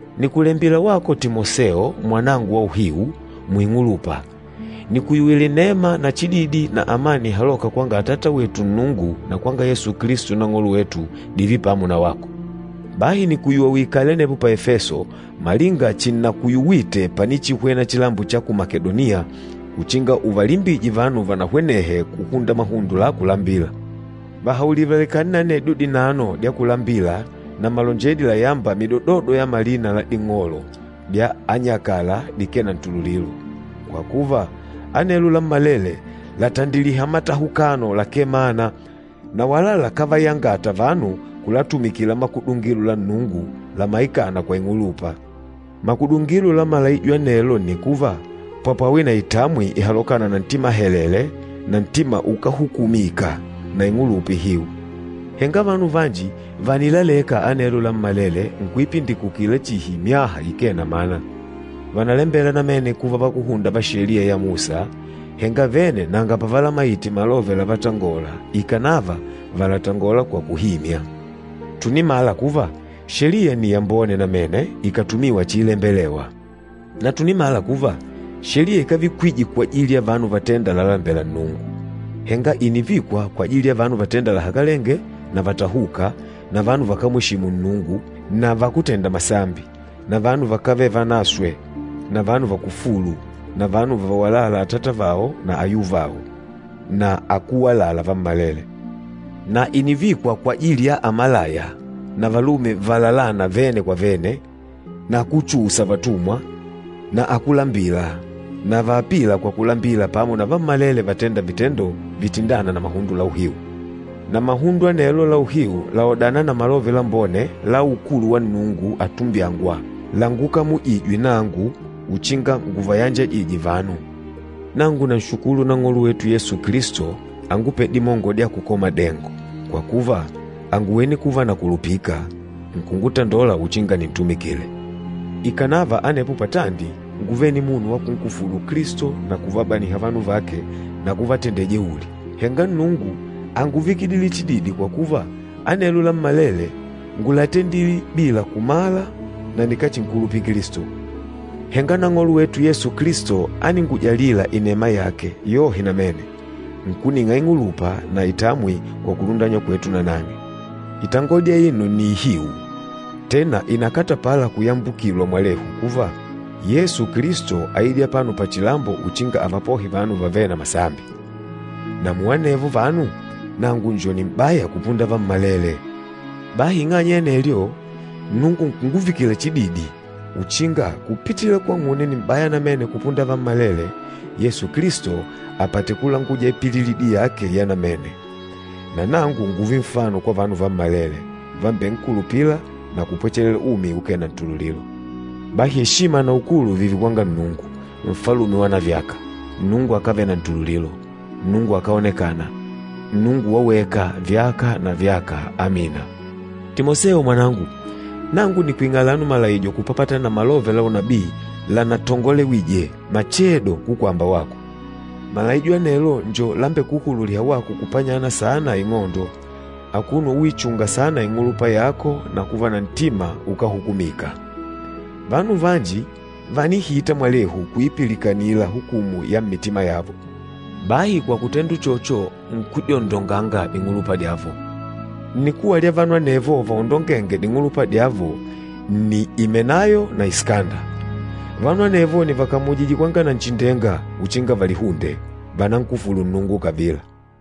Nìkulembila wako Timoseo mwanangu wa uhiu muing'ulupa. Nìkuyuwila inema na chididi na amani ihalôka kwanga Atata wetu Nnungu na kwanga Yesu Kilisto Nang'olo wetu, dììve pamo na wako. Bahi nìkuyuwa uikale anepo pa Efeso, malinga chinnakuyuwite panichihwena chilambo cha ku Makedoniya, uchinga uvalimbije vanu vanahwenehe kuhunda mahundo la kulambila. Vahaulile valekane na anedyo dinano dya kulambila na malonjedi layâmba midododo ya malina la ding'olo dya anyakala dikee na ntululilo. Kwa kuva, anelo lammalele làtandiliha matahukano lakee mana, na wala lakávayangata vanu kulatumikila makudungilo la Nnungu lamaikâna kwa ing'ulupa. Makudungilo la malaijo anelo nni kuva, papwawe na itamwi ihalokâna na ntima helele na ntima ukáhukumika, na ing'ulupa ihiu. Henga vanu vanji vànilaleka anelo lammalele nkuipindikukila chihi myaha ikee na mana. Vànalembela namene kuva vakúhunda va Sheliya ya Musa, henga vene nanga pavalamaite malove lavatangola ikànava vàlatangola kwa kuhimya. Tùnimala kuva, Sheliya nni yambone namene ikàtumiwa chiilembelewa. Na tùnimala kuva, Sheliya ikávikwije kwajili ya vanu vatênda lalalembela Nnungu, henga ìnivikwa kwajili ya vanu vatênda lahakalenge na vatahûka, na vanu vakámweshimu Nnungu na vakútenda masambi, na vanu vakávele vanaswe na vanu vakufûlu, na vanu vavawalâla atata vao na ayuvao, na akúwalala vammalele. Na ìnivikwa kwajili ya amalaya, na valume valalâna vene kwa vene, na akúchuusa vatumwa, na akúlambila, na vaapîla kwa kulambila pamo na vammalele vatênda vitendo vitindâna na mahundo la uhiu. Na mahundo anelo la uhiu làodana na Malove Lambone la ukulu wa Nnungu atumbyângwa, langukamujijwe nangu uchinga nguvayanjajije vanu. Nangu nanshukulu Nang'olo wetu Yesu Kilisto angupêle dimongo dya kukola madengo, kwa kuva, ànguwene kuva nakulupika, nkungutandola uchinga nintumikile. Ikànava anepo patandi ngúvele nimunu wa kunkufulu Kilisto na kuvabaniha vanu vake na kuvatendela jeuli, henga Nnungu ánguvikidile chididi kwa kuva, anelo lammalele ngúlatendile bila kumala na nikáchinkulupila Kilisto. Henga Nang'olo wetu Yesu Kilisto áningujalila inema yake yohe namene, nkuning'a ing'ulupa na itamwi kwa kulundanywa kwetu na nang'e. Itangodi aino nni ihiu, tena ìnakatapala kuyambukilwa mwalehu kuva, “Yesu Kilisto áidile apano pachilambo uchinga avapohe vanu vavêle na masambi.” Na muanevo vanu, nangu njo nim'baya kupunda vammalele. Bahi ing'anya ya anelyo, Nnungu nkunguvikila chididi uchinga kupitila kwang'une nim'baya namene kupunda vammalele, Yesu Kilisto apate kulanguja ipililidi yake ya namene, na nangu ngùùve nfano kwa vanu vammalele vambenkulupîla na kupwechelela umi ukee na ntululilo. Bahi eshima na ukulu vììve kwanga Nnungu, Nfalume wanavyaka, Nnungu akávele na ntululilo, Nnungu akáonekana, Nnungu waweka, vyaka na vyaka! Amina. Timoseo mwanangu, nangu nìkwing'a alano malaijo kupapatana na malove la unabii lanatongolewije machedo kukwamba wako. Malaijo anelo njo lambekuhululîha wako kupanyana saana ing'ondo, akuno uichunga saana ing'ulupa yako na kuva na ntima ukáhukumika. Vanu vanji vànihita mwalehu kuipilikanila hukumu ya mmitima yavo, bahi kwa kutenda uchocho nkudyondonganga ding'ulupa dyavo. Nnikuwa lya vanu anevo vaondongênge ding'ulupa dyavo nni Imenayo na Isikanda, vanu anevo nìvakamujije kwanga Nanchindenga uchinga valihunde, vanankufùlù Nnungu kavila.